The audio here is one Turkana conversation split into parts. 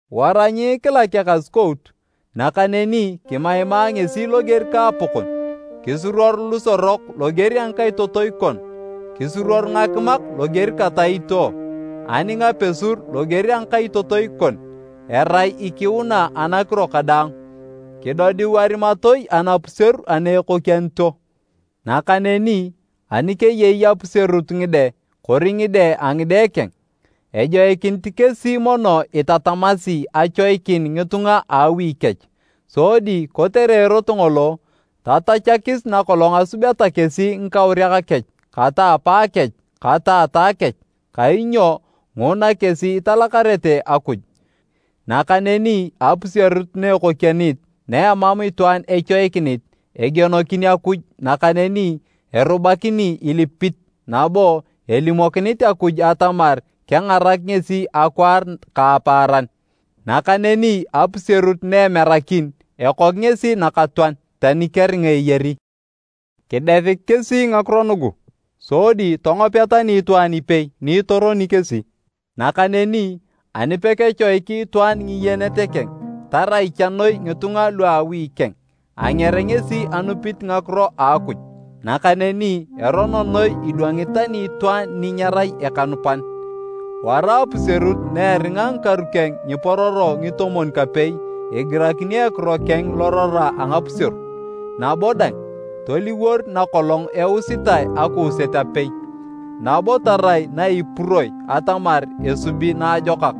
Wara nyiikilak ekasukout, nakaneni kimaima ngesi loger ka apakon. Kisuruor lusorok loger a ngikaitotoi kon, kisuruor ngakimak loger kata itio, ani ngapesur loger a ngakaitotoi kon, erai ikiuna anakiro kadaang. Kidodiu arimatoi anapuseru ana ekokianito. Nakaneni ani keyei apuserut ngide kori ngide a ngide keng, ejoikinit kesi mono itatamasi achoikin ngitunga a awi kech sodi kotere erot ngolo, tatachakis na kolong asubeta kesi ngikauriak kech kata apaakech kata ataa kech, kainyo nguna kesi italakarete Akuj. Nakaneni apuserut na ekokianit na emam itwaan echoikinit, egienokin Akuj nakaneni erubakinit ilipit nabo elimokinit Akuj atamar kengarak ngesi akwaar ka apaaran. Nakaneni apuserut na emerakin, ekok ngesi nakatoan, tani keringa eyari. Kidesik kesi ngakiro nugu sodi tongopea tani itwaan ipei ni itoroni kesi. Nakaneni ani pekechoiki itwaan ngiyenet keng, tarai cha noi ngitunga lua awi keng, anger ngesi anupit ngakiro a Akuj nakaneni erono noi idwangit tani itwaan ni nyerai ekanupan. Wara apuserut na eringa ngikaru keng nyipororo ngitomwon-kapei igirakini ekiro keng lorora a ngapuseru. Nabo dang, toliwor na kolong eusitae akuuset apei. Nabo tarai na ipuroi atamar esubi naajokak,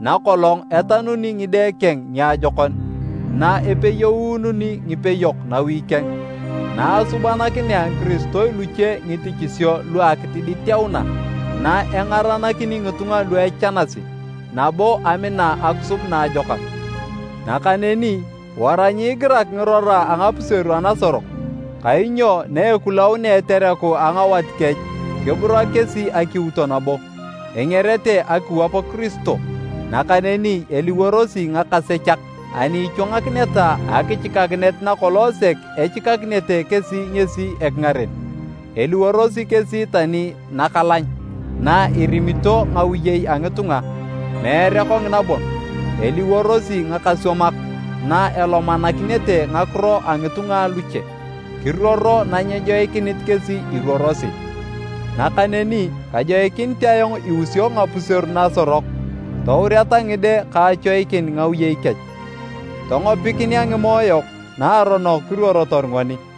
na kolong etanuni ngide keng niajokon, na epeyeununi ngipeyok nawi keng, na asubanakinea ngikiristoi luche ngitichisio lua akitiditeuna, na engaranakini ngitunga lu echanasi nabo amina akisub naajokak. Nakaneni wara nyiigirak ngirora a ngapuseru anasorok, kainyo na ekulaunea etereku a ngawat kech kiburak kesi akiuto nabo, engerete akiwap Kiristo, nakaneni eliworosi ngakasechak ani ichwangakineta akichikakinet na kolong sek echikakinete kesi ngesi ekingaren. Eliworosi kesi tani nakalany na irimito ngawiyei a ngitunga, meere kongina bon, eliworosi ngakaswamak na elomanakinete ngakiro a ngitunga aluche, kiruoro nanyejoikinit kesi iruorosi. Nakaneni kajoikinit ayong iusio ngapuseru nasorok toureta ngide ka achoikin ngiwiyei kech, tongopikinea ngimoe yok naaronok kiruorotor ngoni.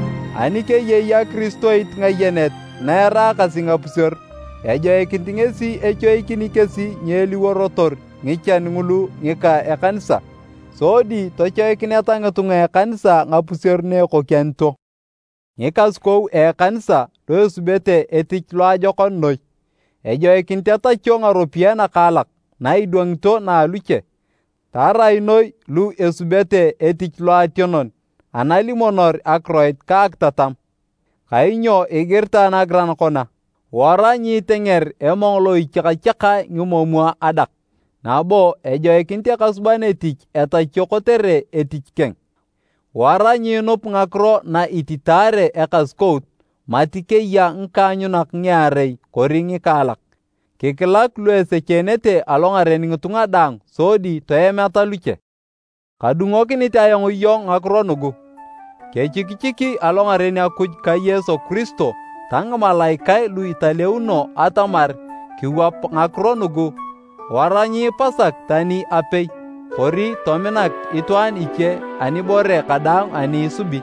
Ani keyei akiristoit ngayenet na eraakasi ngapuseru, ejoikinit ngesi echoikini kesi nyeliworotor ngichan ngulu ngika ekanisa, sodi tochoikineta ngitunga a ekanisa ngapuseru na ekokianito. Ngikasukou a ekanisa lu esubete etich loajokon noi, ejoikinit etachio ngaropiyae nakaalak na idwangito na aluche, tarai noi lu esubete etich loationon analimonor akiroit ka akitatam. Kainyo igiritae nagiran kona, “Wara nyiitenger emong lo ichiakachiakae ngimomwa adak”, nabo “Ejoikinit ekasuban etich etachio kotere etich keng.” Wara nyiinup ngakiro na ititaare ekasukout mati keya ngikaanyunak ngiarei kori ngikaalak. Kikilak lu esecheenete alongaren ngitunga daang sodi toemeta luche. Kadungokinit ayong iyong ngakiro nugu kechikichiki alongaren Akuj ka Yesu Kiristo ta ngimalaikae lu italeuno atamar kiwap ngakiro nugu wara nyiipasak tani apei kori tominak itwaan iche anibore kadaang ani isubi.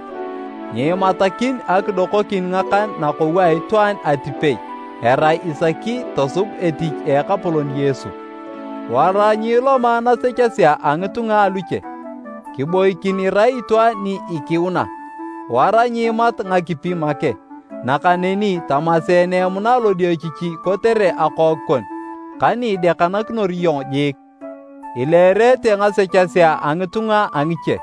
Nyiimatakin akidokokin ngakan nakou a itwaan atipei erai isaki tosub etich a Ekapolon Yesu. Wara nyiiloma nasechesea a ngitunga aluche, kiboikin irai itwaan ni ikiuna. Wara nyiimat ngakipi make, nakaneni tamaseene emuna lodiochichi kotere akook kon ka ni idekanakinor iyong jiik. Ileerete ngasechesea a ngitunga a ngiche,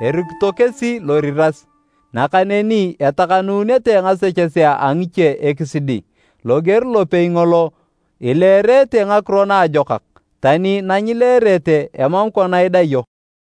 erikito kesi loriras, nakaneni etakanunete ngasechesea a ngiche ekisidi. Loger lopei ngolo ileerete ngakiro naajokak, tani nanyileerete, emam kona idayo.